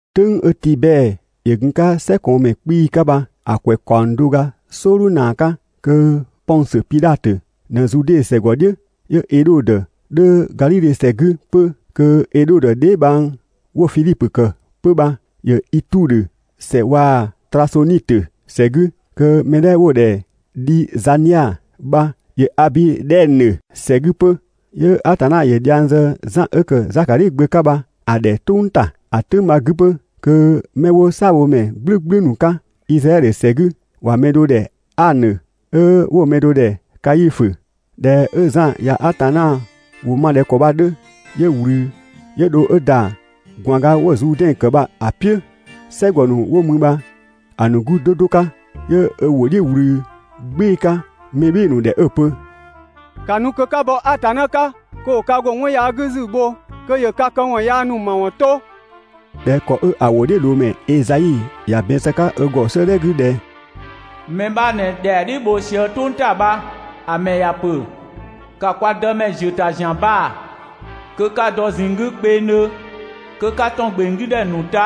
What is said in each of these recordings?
"Tʋ̈ng 'ö Tibɛɛ ‑yö gun‑ 'ka "sɛkɔɔnmɛ 'kpii‑ 'ka bha‑ ‑kwɛ ‑kaɔng do ga "sɔɔdhu ‑naa 'ka, kö Pɔngsö Pidhatö ꞊në Zude ‑sɛgɔdhiʋ̈, 'yö Edhodö 'dhö Gadhidhe ‑sɛ 'gü 'pö, kö Edhodö dheebhang 'wo‑ Fidhipö ‑kë 'pö bha ‑yö Itudhö ‑sɛ waa‑ Trasonitö ‑sɛ 'gü, kö mɛ 'dhɛ 'wo‑ ‑dhɛ Dhizania bha ‑yö Abidhɛnö ‑sɛ 'gü 'pö, 'yö Atanna ‑yö dhiang zë Zan 'ö ‑kë Zakadhi gbö 'ka bha‑ ‑dhɛ "tʋng ‑ta. ‑A "tʋ̈ng bha‑ 'gü 'pö kö 'mɛ 'wo "saabhomɛ "gblʋ̈gblʋ̈ ‑nu 'ka Izraɛdhö ‑sɛ 'gü ‑wa mɛ do ‑dhɛ Anö 'ö 'wo‑ mɛ do ‑dhɛ Kaifö. ꞊Dhɛ 'ö Zan ꞊ya Atanna ‑wʋ ma ꞊dhɛ ‑kɔ bha‑ 'dhö, 'yö ꞊wlü 'yö dho 'ö ‑da ꞊gwaanga 'wo‑ Zuudɛn ‑kë bha‑ "piʋ̈, "sɛgɔ ‑nu 'wo mü bha‑ ‑nu 'gü 'do 'do 'ka, 'yö ö ‑wʋ "dhiʋ̈ ꞊wlü "gbɩɩ‑ 'ka mɛ "bhɩɩ‑ ‑nu ‑dhɛ 'ö‑ pö: «‑Ka nu kö 'ka bɔ Atanna 'ka kö ‑wo ka ‑go 'wɔn yaa 'gü ‑zu bho kö ‑yö ka këwɔn yaa ‑nu ‑mawɔn 'to; ꞊dhɛ ‑kɔ 'ö‑ ‑wʋdhiʋ̈loomɛ Ezai ‑ya ‑bɛn zë‑ 'ka ö ‑gɔ 'sëëdhɛ 'gü ꞊dhɛ: ‹Mɛ 'bha ꞊në ‑dhɛa "dhiʋ̈ bho sië "tʋng ‑ta bha. ‑A ‑mɛ ‑ya ‑pö: ‑Ka kwa Dëmɛ ‑ziö ‑ta ‑zian baa‑ kö 'ka‑ dɔ ꞊zinng 'gü kpengdhö. Kö 'ka ‑tɔn ‑gbeng 'gü ‑dhɛ ‑nu ta,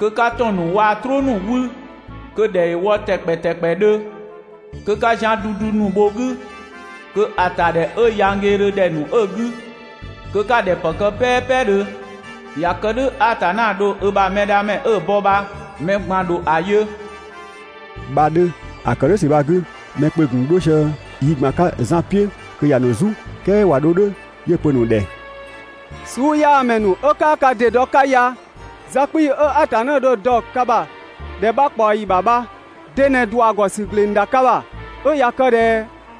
kö 'ka ‑tɔn ‑nu waa‑ "trʋʋ ‑nu 'wü, kö‑ ‑dhɛ ‑yö wɔ ‑tɛkpɛ ‑tɛkpɛdhö, kö 'ka zian dudu ‑nu bho‑ 'gü, kö‑ ‑tadhɛ 'ö yanggeedhö ‑dhɛ ‑nu 'ö‑ 'gü kö 'ka‑ ‑dhɛ ‑pë kë "pɛɛpɛdhö. ꞊Ya kë "dhʋ̈ Atanna dho ö ‑bha Mɛdhamɛ 'ö‑ bɔ bha mɛ ꞊gban ‑dho ‑a yö› bha‑ 'dhö.» ‑A ‑kë "dhʋ̈ ‑sü bha‑ 'gü mɛ kpö‑ ‑gun 'dho sië yi ꞊gban 'ka Zan "piʋ̈ kö ‑ya ‑nu "zu. "Kɛɛ ꞊wa 'dho "dhʋ̈ 'yö‑ pö‑ ‑nu ‑dhɛ: «Suuyaamɛ ‑nu 'ö 'kaa ka ‑dɩ dɔ 'ka ya! Za 'kpii‑ 'ö Atanna dho‑ dɔ ka ‑bha ‑dhɛ 'bha ꞊kpaɔyi ‑bha bha de ꞊në ‑dua ‑gɔ ‑sü ‑gleng ‑da ka ‑bha? 'Ö ꞊ya kë ꞊dhɛ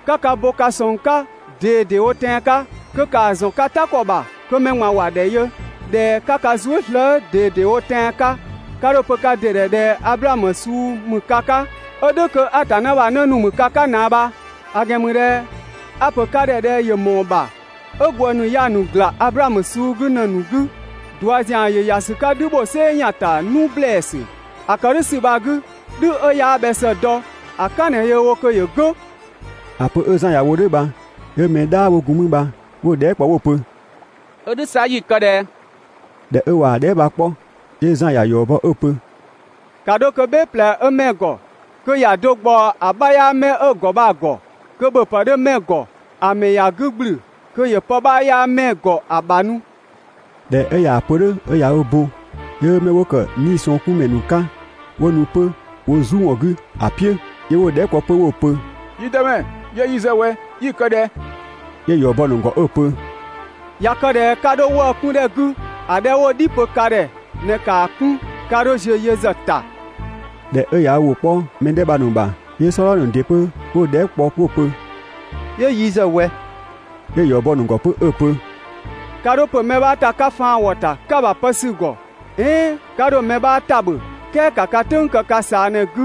'ka ka bo ka sɔng 'ka ꞊dedewo tɛan‑ 'ka kö ‑kaa ‑zɔn ka "ta ‑kɔ ‑bha kö mɛ ꞊gban ‑wa ‑dhɛ yö ꞊dhɛ 'ka ka zuë" slëë" ꞊dedewo tɛan‑ 'ka, 'ka 'dho‑ pö ka ‑dɩ ‑dhɛ ꞊dhɛ Ablaamö suu ‑mü ka 'ka ('ö "dhʋ̈ kö Atanna ‑bha 'në ‑nu ‑mü ka 'ka ꞊naa bha), ‑a ‑gɛn ‑mü ꞊dhɛ a‑ pö ka ‑dhɛ ꞊dhɛ ‑yö ‑mɔɔ ‑bha 'ö ‑gwë ‑nu ya‑ ‑nu ‑gla Ablaamö suu 'gü ‑në ‑nu 'gü. ꞊Dua ‑zian ‑yö ‑ya ‑sü 'ka "dhü ‑bho "sɛɛ ‑yan ‑ta 'nu ‑blɛɛsü. ‑A ‑kë "dhʋ̈ ‑sü bha‑ 'gü, "dhü 'ö 'yaa bhɛ ‑së dɔ ‑a "kan ꞊në yöö wo kö ‑yö "gʋ̈.» ‑A pö 'ö Zan ‑ya wo "dhʋ̈ bha, 'yö mɛ "dhaa 'wo gun mü bha 'wo‑ dhɛɛ" kpɔ 'wo‑ pö: «'Ö "dhʋ̈ 'sa 'yi‑ kë ꞊dhɛ?» ꞊Dhɛ 'ö ꞊wa dhɛɛ" bha‑ 'kpɔ, 'yö Zan ‑ya ‑yɔ bɔ 'ö‑ pö: «‑Ka 'dho kö "bhɛɛ ꞊plɛ 'dhö 'mɛɛ‑ ‑gɔ, kö ‑ya do ꞊gbaɔ‑ 'bha 'yaa 'mɛɛ‑ ‑gɔ bha‑ ‑gɔ. Kö ‑bhöpë 'dhö 'mɛɛ‑ ‑gɔ ‑a ‑mɛ ‑ya 'gü ‑gblü kö ‑yö pë 'bha 'yaa 'mɛɛ‑ ‑gɔ ‑a ‑bha nu.» ꞊Dhɛ 'ö ꞊yaa‑ pö "dhʋ̈ 'ö ꞊ya ö bo, 'yö 'mɛ 'wo ‑kë 'niisɔngkunmɛ ‑nu 'ka 'wo nu 'pö wo "zu ‑wɔn 'gü ‑a "piʋ̈, 'yö 'wo‑ dhɛɛ" kpɔ 'pö 'wo‑ pö: «Yi dëmɛ, 'yö yi ‑zë ꞊wɛ, 'yi‑ kë ꞊dhɛ?» 'Yö‑ ‑yɔ bɔ‑ ‑nu ‑gɔ 'ö‑ pö: «꞊Ya kë ꞊dhɛ 'ka 'dho 'wëë‑ 'kun ‑dhɛ 'gü, ‑a 'dhɛ 'wo‑ "dhi pö ka ‑dhɛ bha ꞊në ‑kaa 'kun, 'ka 'dho ziö yö ‑zë ‑ta.» ꞊Dhɛ 'ö ꞊ya ‑wʋ 'kpɔ mɛ 'dhɛ bha‑ ‑nu ‑bha, 'yö "sɔdha ‑nu ‑dɩ 'pö 'wo‑ dhɛɛ" kpɔ 'wo‑ pö: «'Yö yi ‑zë ꞊wɛ?» 'Yö‑ ‑yɔ bɔ‑ ‑nu ‑gɔ 'pö 'ö‑ pö: «'Ka 'dho ‑pö mɛ 'bha ‑ta 'ka faan ‑wɔ ‑ta 'ka‑ ‑bha pë sü‑ ‑gɔ, "ɛɛn 'ka 'dho mɛ 'bha ‑tabhö, "kɛɛ ‑ka ka "tʋ̈ng kë ka ꞊saa ꞊në‑ 'gü.»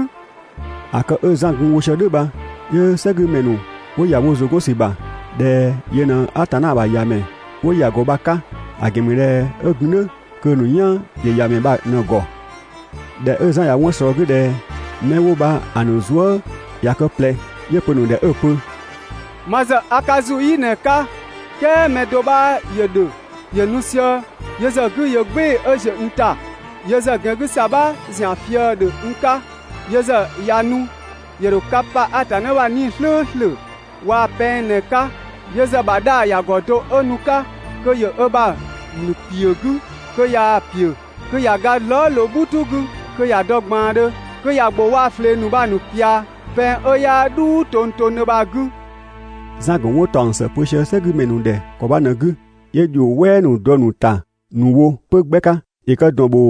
‑A kë 'ö Zan gun‑ wo sië "dhʋ̈ bha, 'yö "sɛgümɛ ‑nu 'wo ‑ya wo ‑zʋ 'gɔn ‑sü ‑bha ꞊dhɛ yö ꞊në Atanna ‑bha ‑Yamɛ 'wo ‑ya ‑gɔ bha‑ 'ka; ‑a ‑gɛn ‑mü ꞊dhɛ 'ö gun "dhʋ̈ kö‑ ‑nu "yan ‑yö ‑Yamɛ bha ꞊në‑ ‑gɔ. ꞊Dhɛ 'ö Zan ꞊ya 'wɔn ꞊slɔɔ 'gü ꞊dhɛ 'mɛ 'wo bha‑ ‑nu zuë" ꞊ya kë ꞊plɛ, 'yö‑ pö‑ ‑nu ‑dhɛ 'ö‑ pö: «Ma ‑zë a ka ‑zu "yi ꞊në 'ka, "kɛɛ mɛ do 'bha ‑yö ‑dhö, ‑yö nu sië, yö ‑zë 'gü ‑yö "gbɩɩ‑ 'ö ‑ziö n ‑ta. Yö ‑zë ‑gɛn 'gü ‑sabha ‑zian fië‑ ‑dhö n 'ka. Yö ‑zë ꞊ya nu ‑yö ‑dho ka pa Atanna ‑bha 'Nii‑ "slʋ̈ʋ̈slʋ̈ waa‑ pɛng ꞊në‑ 'ka. Yö ‑zë ‑bha 'dhaa‑ ‑ya ‑gɔ do 'ö nu‑ 'ka kö ‑yö ö ‑bha ‑mlü ‑piö 'gü, kö ꞊yaa‑ ‑piö kö ‑ya ga zlɔɔ" ꞊loo "bhutu 'gü kö ‑ya dɔ ꞊gbaandhö, kö ‑ya ‑gbʋ waa‑ ꞊flee ‑nu bha‑ ‑nu ꞊pia pɛng 'ö 'yaa "dhuu tongtongdhö bha‑ 'gü.» Zan‑ ‑gun 'wɔn ‑taɔng ‑së pö sië "sɛgümɛ ‑nu ‑dhɛ ‑kɔ bha ꞊në‑ 'gü, 'yö ‑dhio "wɛɛ ‑nu dɔ‑ ‑nu ‑ta ‑nu wo 'pö 'gbɛ 'ka. ‑Yö kë ‑dɔn ‑bho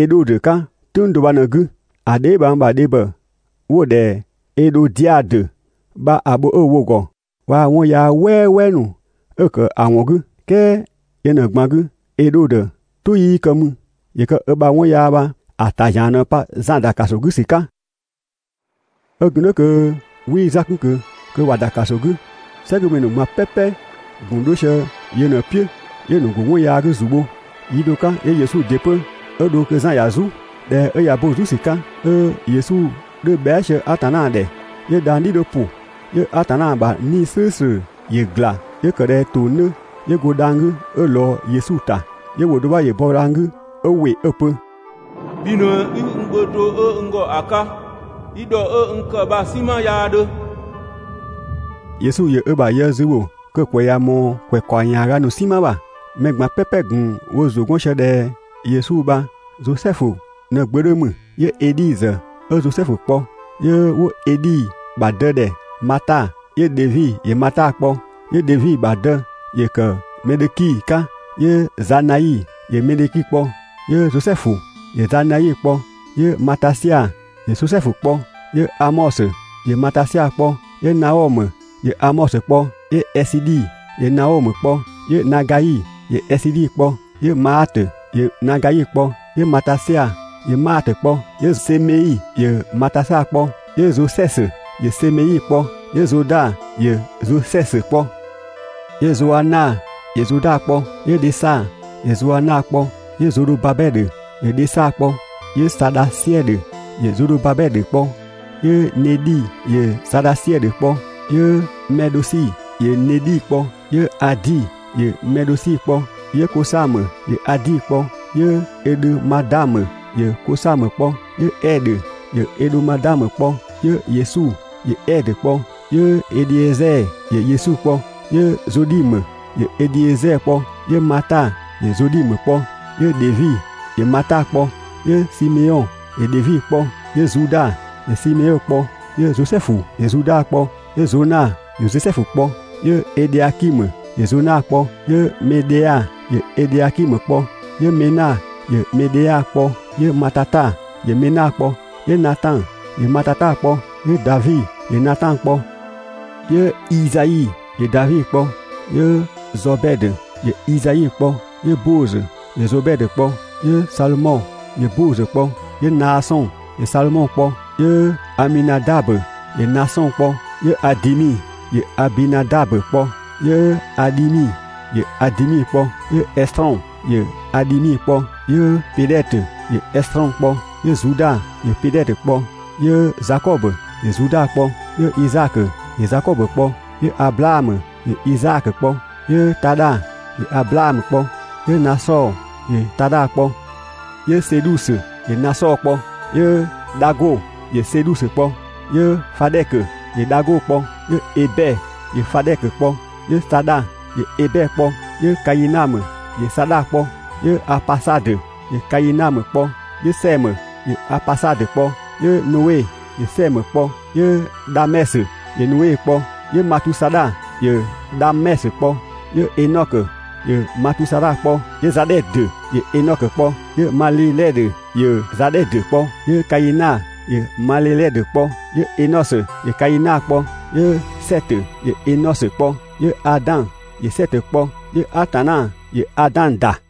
Edhodö 'ka "tʋ̈ng do bha ꞊në‑ 'gü, ‑a dheebhang ‑bha dhebhɔ 'wo‑ ‑dhɛ Edhodiadö bha‑ bho 'ö‑ wo‑ ‑gɔ, waa‑ 'wɔn yaa "wɛɛwɛɛ ‑nu 'ö‑ ‑kë ‑a ‑wɔn 'gü. "Kɛɛ yö ꞊në‑ ꞊gban 'gü, Edhodö "tʋ 'yii kë mü, ‑yö kë ö ‑bha 'wɔn yaa bha‑ ‑ta ‑zian ꞊në‑ pa Zan ‑da ‑kaso 'gü ‑sü 'ka. 'Ö gun kö 'wii Zan 'kun ꞊kö kö ‑wa ‑da ‑kaso 'gü, "sɛgümɛ ‑nu ꞊gban "pɛpɛ‑ ‑gun 'dho sië ‑yö ꞊në‑ "piʋ̈ 'yö‑ ‑nu ‑go 'wɔn yaa 'gü ‑zu bho. Yi do 'ka 'yö Yesu ‑dɩ 'pö 'ö dho kö Zan ‑ya "zu. ꞊Dhɛ 'ö ꞊ya bo‑ "zu ‑sü 'ka 'ö Yesu 'dhö bhɛa" sië Atanna ‑dhɛ, 'yö dhang‑ "dhi 'dhö ‑pʋ. 'Yö Atanna ‑bha 'Nii‑ "slʋ̈ʋ̈slʋ̈ ‑yö ‑gla 'yö ‑kë ꞊dhɛ ‑tong 'dhö 'yö go dhang‑ 'gü 'ö ꞊lɔɔ Yesu ‑ta. 'Yö ‑wʋ do 'bha ‑yö bɔ dhang‑ 'gü 'ö ‑wɩ 'ö‑ pö: «Bhi ꞊në i n gbö do 'ö n ‑gɔ ‑a 'ka, i ‑dhɔ 'ö n ‑kë bha‑ "sinma 'yaa 'dhö.» Yesu ‑yö ö ‑bha yë zü ‑bho kö‑ ‑kwɛ ꞊ya ꞊mɔɔ ‑kaɔng ‑yaaga ‑nu "sinma ‑bha. Mɛ ꞊gban "pɛpɛ ‑gun wo ‑zʋ 'gɔn sië ꞊dhɛ Yesu bha Zosɛfu ꞊në‑ gbö 'dhö ‑mü, 'yö Edhi ‑zë 'ö Zosɛfu kpɔ, 'yö 'wo Edhi ‑bha dë ‑dhɛ Mata, 'yö Dhevi ‑yö Mata kpɔ, 'yö Dhevi ‑bha dë ‑yö ‑kë Mɛdhöki 'ka, 'yö Zanai ‑yö Medhöki kpɔ, 'yö Zosɛfu ‑yö Zanai kpɔ, 'yö Matasia ‑yö Zosɛfu kpɔ, 'yö Amɔsö ‑yö Matasia kpɔ, 'yö Naɔmö ‑yö Amɔsö kpɔ, 'yö Ɛsidhi ‑yö Naɔmö kpɔ, 'yö Nagai ‑yö Ɛsidhi kpɔ, 'yö Maatö ‑yö Nagai kpɔ, 'yö Matasia ‑yö Maatö kpɔ, 'yö Semei ‑yö Matasia kpɔ, 'yö Zosɛsö ‑yö Semei kpɔ, 'yö Zoda ‑yö Zosɛsö kpɔ, 'yö Zoana ‑yö Zoda kpɔ, 'yö Dhesa ‑yö Zoana kpɔ, 'yö Zodhobabɛdhö ‑yö Dhesa kpɔ, 'yö Sadhasiɛdhö ‑yö Zodhobabɛdhö kpɔ, 'yö Nedhi ‑yö Sadhasiɛdhö kpɔ, 'yö Mɛdhosi ‑yö Nedhi kpɔ, 'yö Adi ‑yö Mɛdhosi kpɔ, 'yö Kosamö ‑yö Adi kpɔ, 'yö Ɛdhömadamö ‑yö Kosamö kpɔ, 'yö Ɛdhö ‑yö Ɛdhömadamö kpɔ 'yö Yesu ‑yö Ɛdhö kpɔ, 'yö Edhiezɛɛ ‑yö Yesu kpɔ, 'yö Zodhimö ‑yö Edhiezɛɛ kpɔ, 'yö Mata ‑yö Zodhimö kpɔ, 'yö Dhevi ‑yö Mata kpɔ, 'yö Simeɔn ‑yö Dhevi kpɔ, 'yö Zuda ‑yö Simeɔn kpɔ, 'yö Zosɛfu ‑yö Zuda kpɔ, 'yö Zona ‑yö Zosɛfu kpɔ, 'yö Edhiakimö ‑yö Zona kpɔ, 'yö Medhea ‑yö Edhiakimö kpɔ, 'yö Mena ‑yö Medhea kpɔ, 'yö Matata ‑yö Mena kpɔ, 'yö Natan ‑yö Matata kpɔ, 'yö Davi ‑yö Natan kpɔ, 'yö Izai ‑yö Davi kpɔ, 'yö Zɔbɛdö ‑yö Izai kpɔ, 'yö Boozö ‑yö Zobɛdö kpɔ, 'yö Salmɔ ‑yö Boozö kpɔ, 'yö Naasɔn ‑yö Salmɔ kpɔ, 'yö Aminadabö ‑yö Naasɔn kpɔ, 'yö Adimi ‑yö Abinadabö kpɔ, 'yö Adhimi ‑yö Adimi kpɔ, 'yö Ɛsrɔn ‑yö Adhimi kpɔ, 'yö Pedhɛtö ‑yö Ɛsrɔn kpɔ, 'yö Zuda ‑yö Pedhɛtö kpɔ, 'yö Zakɔbö ‑yö Zuda kpɔ, 'yö Izaakö ‑yö Zakɔbö kpɔ, 'yö Ablaamö ‑yö Izaakö kpɔ, 'yö Tadha ‑yö Ablaamö kpɔ, 'yö Nasɔɔ ‑yö Tadha kpɔ, 'yö Sedhusö ‑yö Nasɔɔ kpɔ, 'yö Dhago ‑yö Sedhusö kpɔ, 'yö Fadhɛkö ‑yö Dhago kpɔ, 'yö Ebɛ ‑yö Fadhɛkö kpɔ, 'yö Sadha ‑yö Ebɛ kpɔ, 'yö Kainamö ‑yö Sadha kpɔ, 'yö Apasadö ‑yö Kainamö kpɔ, 'yö Sɛmö ‑yö Apasadö kpɔ, 'yö Noe ‑yö Sɛmö kpɔ, 'yö Dhamɛsö ‑yö Noe kpɔ, 'yö Matusadha ‑yö Dhamɛsö kpɔ, 'yö Enɔkö ‑yö Matusadha kpɔ, 'yö Zadhɛdö ‑yö Enɔkö kpɔ, 'yö Malelɛdhö ‑yö Zadhɛdö kpɔ, 'yö Kaina ‑yö Malelɛdhö kpɔ, 'yö Enɔsö ‑yö Kaina kpɔ, 'yö Sɛtö ‑yö Enɔsö kpɔ, 'yö Adan ‑yö Sɛtö kpɔ, 'yö Atanna ‑yö Adan ‑da.